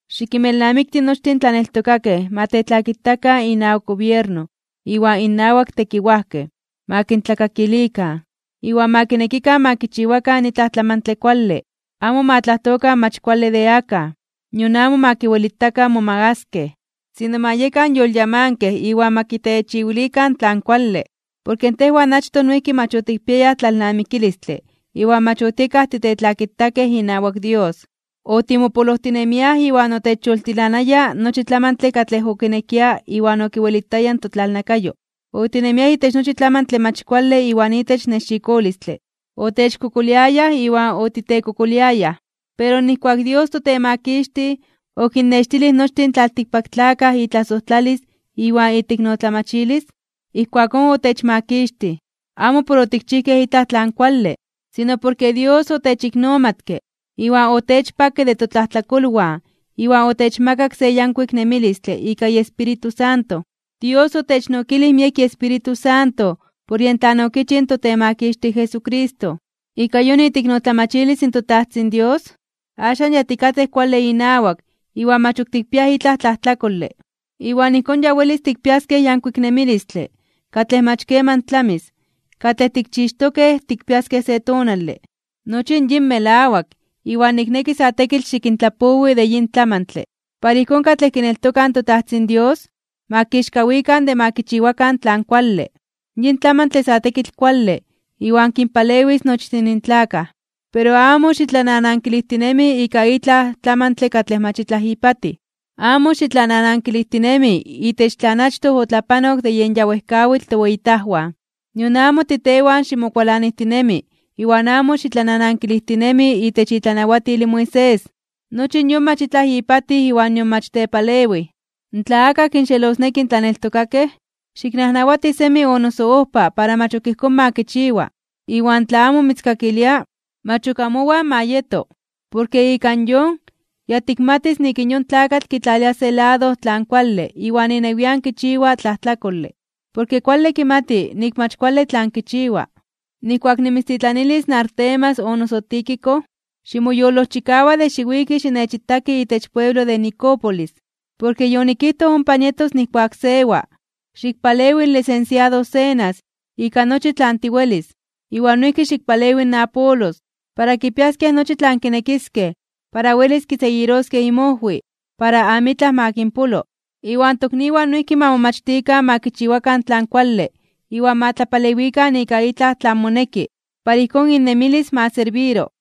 Xikinmelnamikti nochtin in tlaneltokakej ma tetlakitakan inawak gobierno iwan innawak tekiwajkej, ma kintlakakilikan, iwan ma kinekikan ma kichiwakan itlaj tlamantle kuale. Amo ma tlajtokan mach kuale de akaj, nion amo ma kiwelitakan momagaskej (momakaskej), sino ma yekan yolyamankej iwan ma kitechiwilikan tlan kuale. Porke tejwan achtoj noijki mach otikpiayaj tlalnamikilistle iwan mach otiekaj titetlakitakej inawak Dios. Otimopolojtinemiaj iwan otechyoltilanaya nochi tlamantle katlej okinekia iwan okiwelitaya in totlalnakayo. Otinemiaj itech nochi tlamantle mach kuale iwan itech nexikolistle. Otechkokoliayaj iwan otitekokoliayaj. Pero nijkuak in Dios toTemakixtij okinnextilij nochtin in tlaltikpaktlakaj itlasojtlalis iwan iteiknotlamachilis, ijkuakón otechmakixtij. Amo por otikchijkej itlaj tlan kuale, sino porke Dios otechiknomatke iwan otechpakke de totlajtlakolwan iwan otechmakak se yankuik nemilistle ika iEspíritu Santo. Dios otechnokilij miek iEspíritu Santo por yen tlan okichij in toTemakixtij Jesucristo. Ika yon iteiknotlamachilis in toTajtzin Dios, axan ya tikatej kuale inawak iwan mach ok tikpiaj itlaj tlajtlakole. Iwan ijkón ya welis tikpiaskej in yankuik nemilistle katlej mach keman tlamis katlej tikchixtokej tikpiaskej se tonale. Nochi yin melawak, iwan nikneki sa tekitl xikintlapowi de yin tlamantle, para ijkón katlej kineltokaj in toTajtzin Dios ma kixkawikan (ma momelikaj) de ma kichiwakan tlan kuale. Yin tlamantle sa tekitl kuale iwan kinpalewis nochtin in tlakaj. Pero amo xitlananankilijtinemi ika itlaj tlamantle katlej mach itlaj ipatij. Amo xitlananankilijtinemi itech tlan achtoj otlapanok de yen ya wejkawitl toweyitajwan, nion amo titewan ximokualanijtinemi iwan amo xitlananankilijtinemi itech itlanawatil in Moisés. Nochi yon mach itlaj ipatij iwan nion mach tepalewij. Tla akaj kinxelosneki in tlaneltokakej, xiknajnawati semi o noso ojpa para mach ok ijkón ma kichiwa, iwan tla amo mitzkakilia, mach ok amowan ma yeto. Porke ika yon, ya tikmatis nik in yon tlakatl kitlalia se lado tlan kuale iwan inewian kichiwa tlajtlakole. Porke kuale kimati nik mach kuale tlan kichiwa. Nijkuak nimitztitlanilis Artemas o noso Tíquico, ximoyolojchikawa de xiwiki xinechitaki itech pueblo de Nicópolis, porke yonikijtoj ompa nietos nijkuak sewas. Xikpalewi in lisensiado Zenas ika nochi tlan tiwelis, iwan noijki xikpalewi in Apolos, para kipiaskej nochi tlan kinekiskej para welis kiseguiroskej inmojwi, para amitlaj ma kinpolo. Iwan tokniwan noijki ma momachtikan ma kichiwakan tlan kuale iwan ma tlapalewikan ika itlaj tlan moneki, para ijkón innemilis ma serbiro.